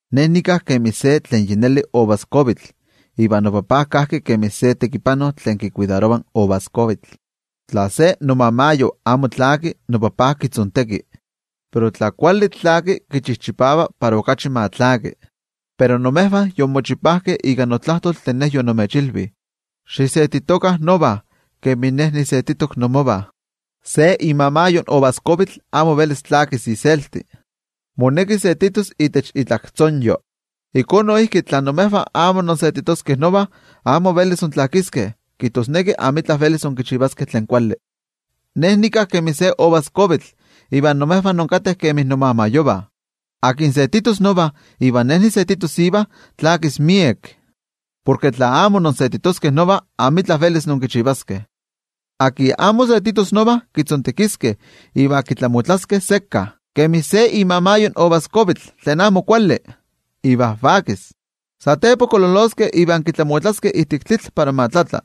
’Ne nika kemi se tlen yi neli uvaskuavitl iva noTajtzi kajki kemi se tekipano tlen kikuidarova in uvaskuavitl. Tla se nomamayo amo tlaki, noTajtzi kitzonteki. Pero tla kuali tlaki kichijchipava para okachi ma tlaki. Iva imejvah yonmochipajkeh, ika notlajtol tlen Ne yonimechilvi. Xisetitokah nova, kemin Ne nisetitok inmovah. Se imamayo in uvaskuavitl amo velis tlakis iselti. Moneki setitos itech itlaktzonyo. Ijkó noijki, tla imejvah amo insetitoskeh nova, amo velis intlakiskeh, kijtosneki amitla velis inkichivaskeh tlen kuali. ’Ne nika kemi se uvaskuavitl iva imejvah inkateh kemi nomamayovah. Tlen setitos nova iva Ne nisetitos iva, tlakis miek. Porke tla amo insetitoskeh nova, amitla velis inkichivaskeh. Tlen amo setitos nova, kitzontekiskeh iva kitlamotlaskeh sekka kemi se imamayo in uvaskuavitl tlen amo kuali, iva vakis. Satepa kololoskeh iva kitlamotlaskeh ijtik tlitl para ma tlatla.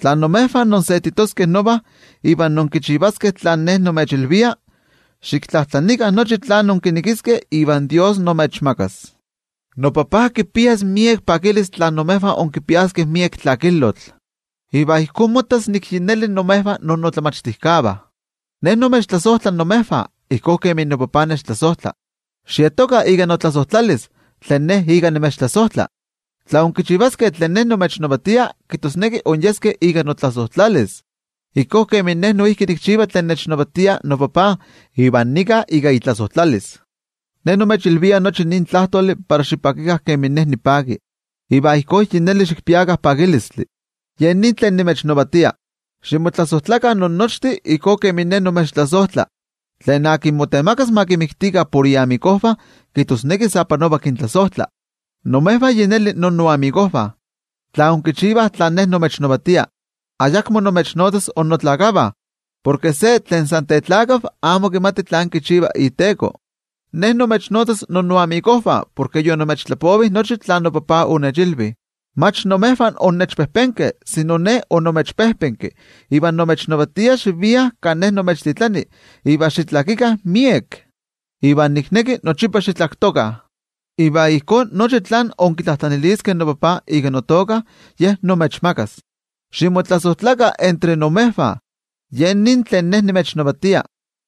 ’Tla imejvah insetitoskeh nova iva inkinchivaskeh tlen nimechilvia, xiktlajtlanikah nochi tlen inkinekiskeh iva Dios imechmakas. NoTajtzi kipias miek pakilistli tla imejvah inkipiaskeh miek tlakilotl, iva ijkó mottas nik yi neli imejvah inmomachtijkeh de Ne. Ne nimechtlasojtla imejvah ijkó kemi noTajtzi nechtlasojtla. Xietokah ika notlasojtlalis tlen Ne ika nimechtlasojtla. Tla inkichivaskeh tlen nimechnavatia, kijtosneki inyeskeh ika notlasojtlalis, ijkó kemin Ne noijki nikchiva tlen nechnavatia noTajtzi iva nika ika itlasojtlalis. ’Ne nimechilvia nochi nin tlajtoli para xipakikah kemin Ne nipaki, iva ijkó yi neli xikpiakah pakilistli. Ye nin tlen nimechnavatia: Ximotlasojtlakah innochtin ijkó kemin Ne nimechtlasojtla. Tlen motemakas ma kixpolokah por iyoliknivah kijtosneki sa panova kintlasojtla. Imejvah yi neli innoyoliknivah, tla inkichivah tlen nimechnavatia. Ayakmo nimechnotzas innotlakavah, porke se tlen san tetlakav amo kimati tlen kichiva iteko. Ne Nimechnotzas innoyoliknivah, porke yonimechtlapovi nochi tlen noTajtzi onechilvi. Mach imejvah onnechpejpenkeh, sino Ne onimechpejpenki iva nimechnavatia xiviah kan Ne nimechtitlani iva xitlakikah miek. Iva nikneki nochipa xitlaktokah. Iva ijkó nochi tlen inkitlajtlaniliskeh noTajtzi ika notoka, Ye imechmakas. Ximotlasojtlakah entre imejvah. Ye nin tlen nimechnavatia.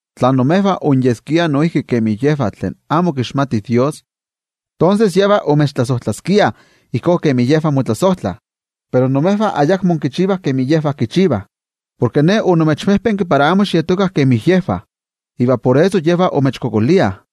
Tla imejvah onyeskiah noijki kemi yejvah tlen amo kixmatih Dios, tonses yejvah omechtlasojtlaskiah ijkó kemi yejvah motlasojtlah. Pero imejvah ayakmo inkichivah kemi yejvah kichivah, porke Ne onimechpejpenki para amo xietokah kemi yejvah, iva por eso yejvah imechkualankaitah.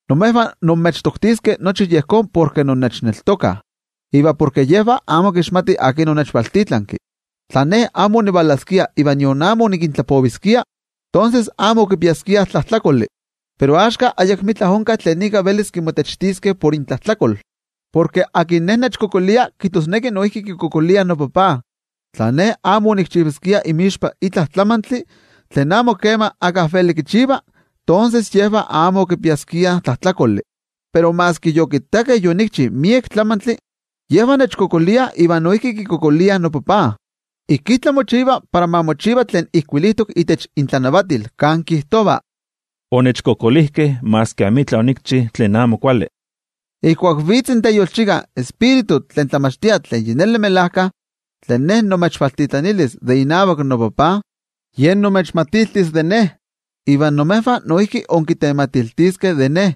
Imejvah imechtoktiskeh nochi yejón porke innechneltokah, iva porke yejvah amo kixmatih akin onechvaltitlanki. ’Tla Ne amo onivalaskia iva nion amo onikintlapoviskia, tonses amo okipiaskiah tlajtlakoli. Pero axka ayakmitla onka tlen ika velis motenpaleviskeh de intlajtlakol. Porke tlen nechkualankaita, kijtosneki noijki kikualankaita noTajtzi. Tla Ne amo onikchivaskia inmixpa itla tlamantli tlen amo kema íkka veli kichiva, tonses yejvah amo okipiaskiah tlajtlakoli. Pero maski yokittakeh yonikchi miek tlamantli, yejvah nechkualankaitah iva noijki kikualankaitah noTajtzi. Ijkí tlamochiva para ma mochiva tlen ijkuilitok itech intlanavatil, kan kijtova: “Onechkualankaitakeh maski amitla onikchi tlen amo kuali.” ’Ijkuak vitz in Teyolchika, in Tioijyotzintli tlen tlamachtia tlen melajkayotl, tlen Ne nimechvaltitlanilis de inavak noTajtzi, Ye imechmatiltis de Ne. Iva imejvah noijki inkitematiltiskeh de Ne,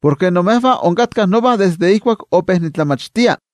porke imejvah onkatkah nova desde ijkuak ope nitlamachtia.